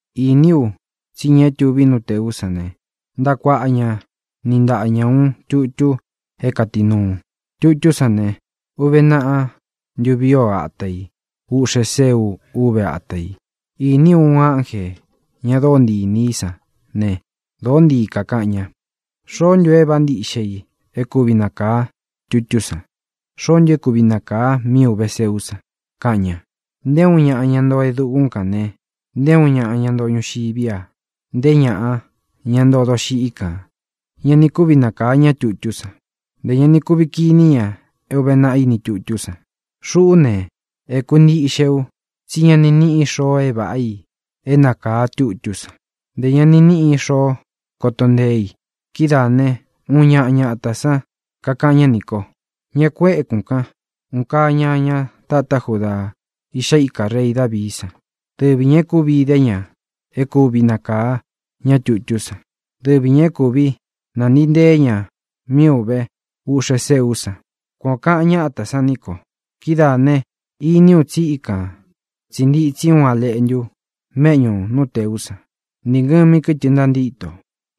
Īní u tsí ña é tuví nú tēú san ne, ntaꞌa kuaꞌa ña niꞌi ntaꞌa ña ūun tutu é kātinuu. Tutú san ne, uve naꞌa ntuví o ata i. Úꞌxe sēu úve ata i. Īní u uun ánjē, ña dóo ntii inī í san ne, dōó ntii kakaꞌan ña: —¿Xoó ntu é vāꞌá ntiꞌxe i é kuvi nakāa tutú san? ¿Xoó ntu é kuvi nakāa mí uve seú san? —kaꞌan ña. Nté uun ñaꞌa, ña ntoo e dukún kān ne, nté uun ñaꞌa, ña ntoo ñuxiví a, nté ñaꞌa, ña ntoo doxiꞌí kān, ña ni kúvi nakāa ñá tutú san, ntē ña ni kuvi kiní ña é ūve naꞌa iní tutú san. Xuꞌú ne, ēku ntíꞌxe u, tsí ña ni níꞌi xoo e váꞌa i é nakāa tutú san, ntē ña ni níꞌi xoo koto nteé i. Kidáā né, uun ñaꞌa ñatā sán kakaꞌan ñá nī ko: —Ñá kū ékūn kan. ¡Un kaa Ñaña tatá Judaa, Iꞌxá ika rei Dāvií san! Dɨvi ñā e kúvi idé ña é kuvi nakaā ñá tutú san. Dɨvi ñā e kúvi nantīi ntée ña mí ūve uꞌxe séú san —kuan ō kaꞌan ñátā san ní ko. Kidáā ne, iní u tsi íkan tsī ntitsi uun A Leꞌntu méꞌñū nú tēú san, ni ngɨ̄mi kɨtɨ ntantíto,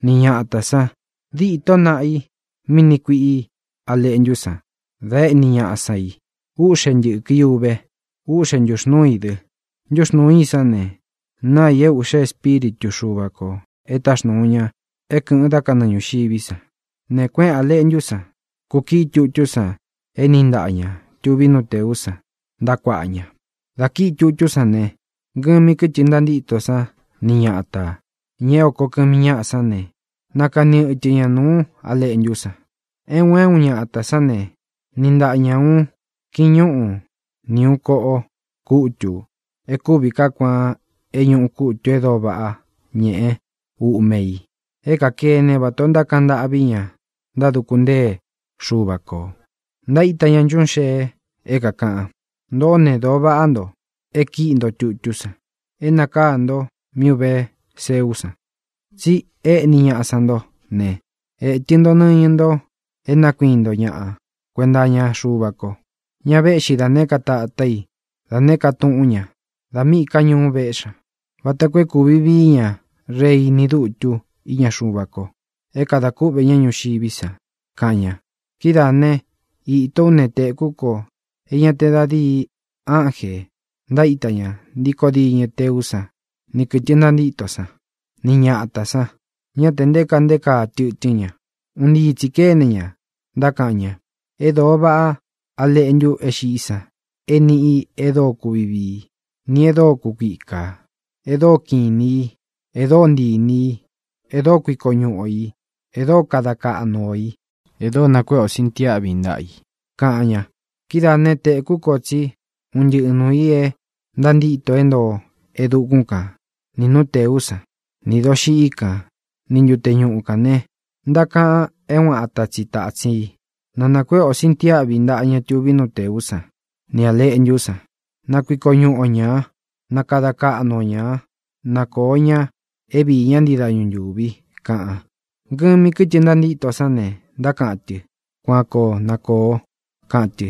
ni ñatā san. Dîtó naꞌa i mí niꞌi kuiꞌi A Leꞌntú san da éꞌni ñaꞌa sán i. Úꞌxe ntɨ̄kɨ i uve. Úꞌxe ntūxnúu i dɨ. Ntúxnūú i sán ne, náa i é ūꞌxe espíritu Xuva kō e táxnūu ña é kɨ̄ꞌɨn dá kanɨɨ ñūxiví san. Ne, kuéꞌēn A Leꞌntú san, kukiꞌi tutú san é niꞌi ntāꞌa ña tuví nú tēú san ntaꞌa kuaꞌa ña. Dā kíꞌi tutú san ne, ngɨmi kɨtɨ ntantíto san ni ñatā, ña é oko kɨmi ñáꞌa sán ne, nākani ɨtɨ ña nuú A Leꞌntú san. É un é un ñatā sán ne, niꞌi ntaꞌa ña ūun kiñúꞌu ni ūun koꞌo kútū e kúvi kaá kuaan é ñūꞌu kútū e dóo váꞌa ñeꞌe úꞌme ī é kakene vatā ó ntákaꞌan ntâꞌví ña ntáduku ntée Xuva kō. Ntaíta ña nchuꞌún xee é kākaꞌan: Ntōꞌó ne, dōo vaꞌá nto é kīꞌi nto tutú san, é nākaá nto mí ūve seú san. Tsi éꞌni ñaꞌa san ntó ne, ētɨ nto nɨñɨ nto é nakuíin nto ñaꞌa kuenta iña Xuva ko, ña véꞌxi da nēé ka tatá i, da nēé ka túꞌun ñā, da míꞌī ká ñuu véꞌxi ña, vata koo é kūvi vií ña rei ni dutu íña Xuva ko, é kadā kúꞌvē ñá ñuxiví san, kaꞌan ña. Kidáā né, īto ú ne, tēkú ko é ña te da díi ánjē ntaíta ña ntíkō diñɨ teú san ni kɨ̄tɨ ntantíto san, ni ñatā san. Ñá tē nté kaa nté kaa tɨtɨ́n ña. Un ntii tsī kéne ña, ntákaꞌan ña: ¡E dóo vaꞌá A Leꞌntu é xiꞌí san é nīꞌi e dóo kuvi vií, nī e dóo kukuikā, e dóo kiꞌin inī í, e dóo ntii inī i, e dóo kuiko ñuꞌu o ī, e dóo kada kaꞌnu o ī, e dóo nakueꞌe o sintiáꞌvi ntaꞌa i!, kaꞌan ña. Kídaā né, tēkú ko tsí un ntɨꞌɨ nuū i é ntantíto é ntoo e dukún kan, nī nú nteꞌú san, nī doxiꞌí kan, ni ntute ñuꞌu kān ne, ntákaꞌan é uun ata tsi tātsin i: ¡Na nākuéꞌe o sintiáꞌvi ntaꞌa ña tuví nú tēú san, nī A Leꞌntú san; na kuiko ñuꞌu o ñā; na kada kaꞌnu o ñā; na kōo ña é viī ñá ntii dañu ntūvi!, kaꞌan. Ngɨmi kɨtɨ ntantíto sán ne, ntákaꞌan tɨ: —¡Kuan koo na kōo! —kaꞌan tɨ.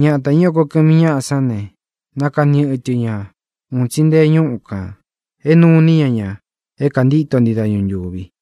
Ñatā, ña é oko kɨmi ñáꞌa sán ne, nākani ɨtɨ ña un tsi nte ñúꞌu kān é nuu iní ña ña é kāntíto ntii dañu ntūvi.